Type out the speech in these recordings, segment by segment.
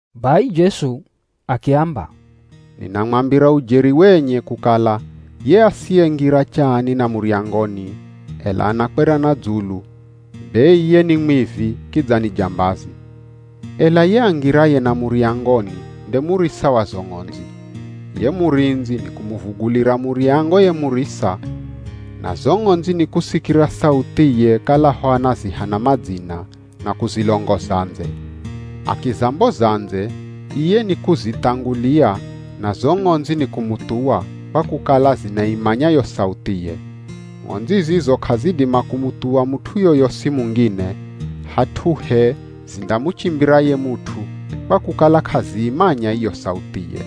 Bai Jesu akiamba, “Ninamwambira ujeri wenye kukala ye asiyengira chaani na muryangoni, ela anakwera na dzulu, be iye ni mwivi kidza ni jambazi. Ela ye angiraye na muryangoni nde murisa wa zo ng'ondzi. Ye murindzi ni kumuvugulira muryango ye murisa, na zo ng'ondzi nikusikira sauthiye kalaho anaziha na madzina na kuzilongoza ndze. Akizamboza ndze, iye nikuzithangulia na zo ng'ondzi ni kumuthuwa, kwa kukala zinaimanya yo sauthiye. Ng'ondzi zizo k'azidima kumuthuwa mut'u yoyosi mungine, hat'uhe zindamuchimbira ye mut'u, kwa kukala k'aziimanya iyo sauthiye.”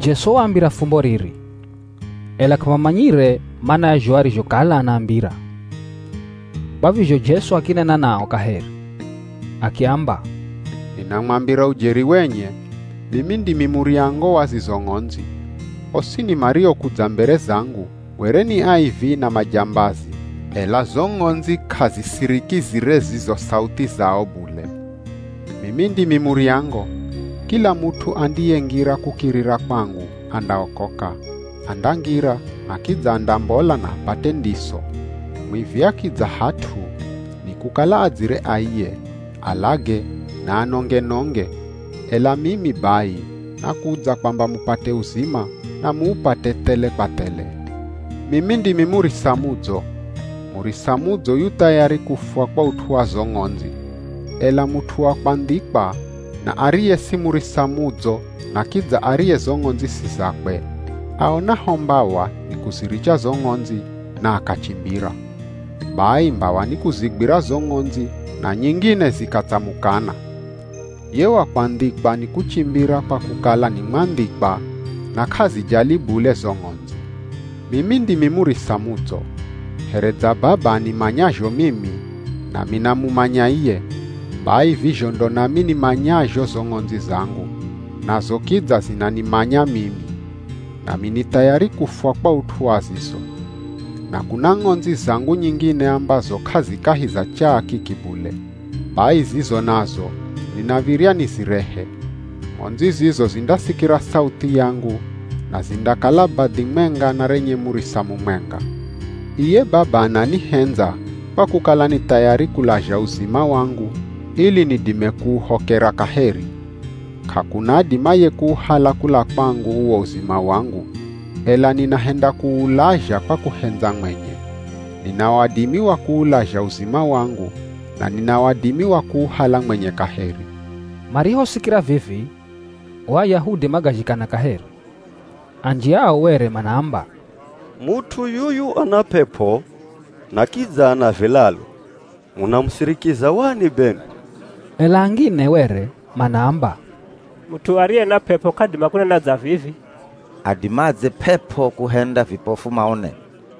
Jesu waambira fumbo riri, ela k'amamanyire mana ya zho arizhokala anaambira. Kwa vizho Jesu akinena nao kaheri, akiamba, “Ninamwambira ujeri wenye, mimi ndimi muryango wa zizo ng'ondzi. Osini mariokudza mbere zangu were ni aivi na majambazi, ela zo ng'ondzi k'azisirikizire zizo sauthi zao bule. Mimi ndimi muryango. Kila mut'u andiyengira kukirira kwangu andaokoka, andangira na kidza andambola na apate ndiso. Mwivi akidza hat'u, nikukala adzire aiye, alage na anonge-nonge, ela mimi bai nakudza kwamba mupate uzima, na muupate thele kwa thele. “Mimi ndimi murisa mudzo. Murisa mudzo yu thayari kufwa kwa ut'u wa zo ng'ondzi. Ela mut'u wa kwandhikwa na ariye si murisa mudzo na kidza ariye zo ng'ondzi si zakwe, aonaho mbawa ni kuziricha zo ng'ondzi, na akachimbira. Bai mbawa ni kuzigwira zo ng'ondzi na nyingine zikatsamukana. Ye wa kwandhikwa ni kuchimbira kwa kukala ni mwandhikwa na k'azijali bule zo ng'ondzi. “Mimi ndimi murisa mudzo. Here dza Baba animanyazho mimi, nami namumanya iye, bai vizho ndo nami nimanyazho zo ng'ondzi zangu, nazo kidza zinanimanya mimi. Nami ni thayari kufwa kwa ut'u wa zizo. Na kuna ng'ondzi zangu nyingine ambazo k'azi kahi za chaa kiki bule. Bai zizo nazo ninav̱irya nizirehe. Ng'ondzi zizo zindasikira sauthi yangu, na zindakala badhi mwenga na renye murisa mumwenga. Iye Baba ananihendza kwa kukala ni thayari kulazha uzima wangu ili nidime kuuhokera kaheri. K'akuna adimaye kuuhala kula kwangu uwo uzima wangu, ela ninahenda kuulazha kwa kuhendza mwenye. Nina wadimi wa kuulazha uzima wangu na nina wadimi wa kuuhala mwenye kaheri.” Marihosikira vivi o Ayahudi magazhikana kaheri. Anji ao were manaamba, “Mut'u yuyu ana p'ep'o na kidza ana vilalu, munamusirikiza wani benwi?” Ela angine were manaamba, “Mut'u ariye na p'ep'o k'adima kunena dza vivi. Adimadze p'ep'o kuhenda vipofu maone?”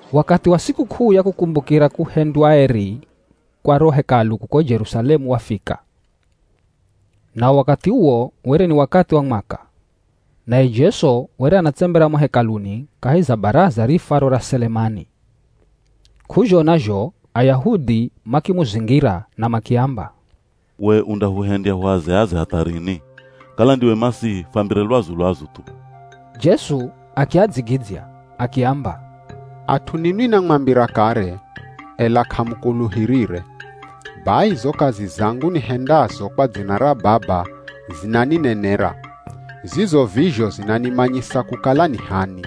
Wakathi wa sikuk'uu ya Kukumbukira Kuhendywa Eri kwa ro Hekalu kuko Jerusalemu wafika. Nao wakathi uwo were ni wakathi wa mwaka. Naye Jesu were anatsembera mo Hekaluni kahi za baraza riifwaro ra Selemani. K'uzhona zho Ayahudi makimuzingira na makiamba, “We undahuhendya huaze-aze hatha rini? Kala ndiwe Masihi fwambire lwazu-lwazu thu.” Jesu akiadzigidzya akiamba, “At'u ninwi namwambira kare, ela k'amukuluhirire. Bai zo kazi zangu nihendazo kwa dzina ra Baba zinaninenera, zizo vizho zinanimanyisa kukala ni h'ani.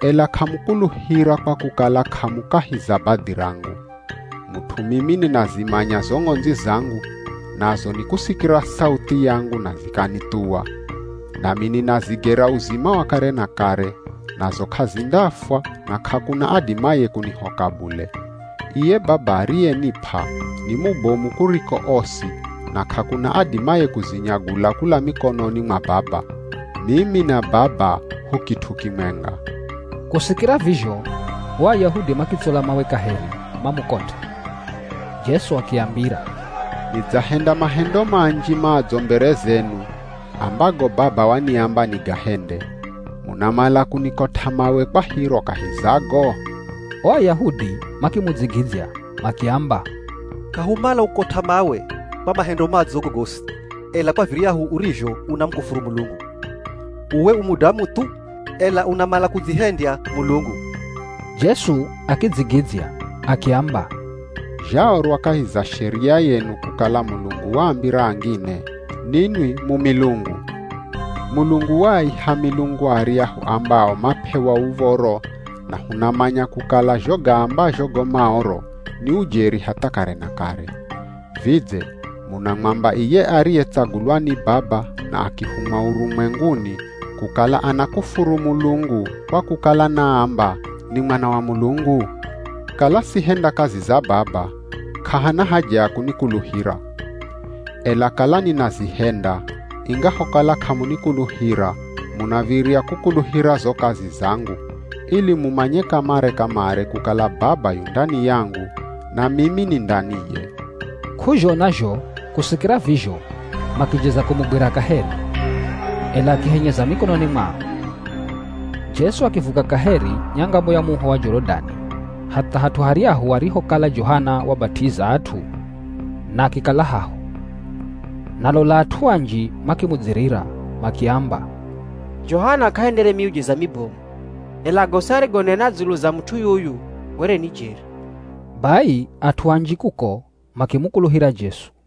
“Ela k'amukuluhira kwa kukala k'amu kahi za badhi rangu. Mut'u mimi ninazimanya zo ng'ondzi zangu, nazo nikusikira sauthi yangu na zikanithuwa, nami ninazigera uzima wa kare na kare, nazo k'azindafwa na k'akuna adimaye kunihoka bule. Iye Baba ariyenip'a ni mubomu kuriko osi na k'akuna adimaye kuzinyagula kula mikononi mwa Baba. Mimi na Baba hu kit'u kimwenga.” Kusikira vizho o Ayahudi makitsola mawe kaheri mamukot'e. Jesu akiambira, “Nidzahenda mahendo manji madzo mbere zenu ambago Baba waniamba nigahende. Munamala kunikot'a mawe kwa hiro kahi za go?” O Ayahudi makimudzigidzya makiamba, “K'ahumala kukukot'a mawe kwa mahendo madzo gogosi, ela kwa viryahu urizho unamukufuru Mulungu! Uwe u mudamu thu, ela unamala kudzihendya Mulungu.” Jesu akidzigidzya akiamba, “Zhaorwa kahi za Sheria yenu kukala Mulungu waambira angine, ‘Ninwi mu milungu.’ Mulungu waaiha milungu aryahu ambao map'ewa uv̱oro na hunamanya kukala zho gaambazho go Maoro ni ujeri hatha kare na kare. Vidze munamwamba iye ariyetsagulwa ni Baba na akihumwa urumwenguni, kukala anakufuru Mulungu kwa kukala naamba, ‘Ni Mwana wa Mulungu’? Kala sihenda kazi za Baba, k'ahana haja ya kunikuluhira. Ela kala ninazihenda, ingahokala k'amunikuluhira munav̱irya kukuluhira zo kazi zangu, ili mumanye kamare-kamare kukala Baba yu ndani yangu, na mimi ni ndaniye.” K'uzhona zho kusikira vizho makijeza kumugwira kaheri, ela akihenyeza mikononi mwao. Jesu akivuka kaheri nyangamo ya muho wa Jorodani hatha hat'u haryahu arihokala Johana wabat'iza at'u na akikala haho. Na lola at'u anji makimudzirira makiamba, “Johana k'ahendere miujiza mibomu, ela gosi arigonena dzulu za mut'u yuyu were ni jeri.” Bai at'u anji kuko makimukuluhira Jesu.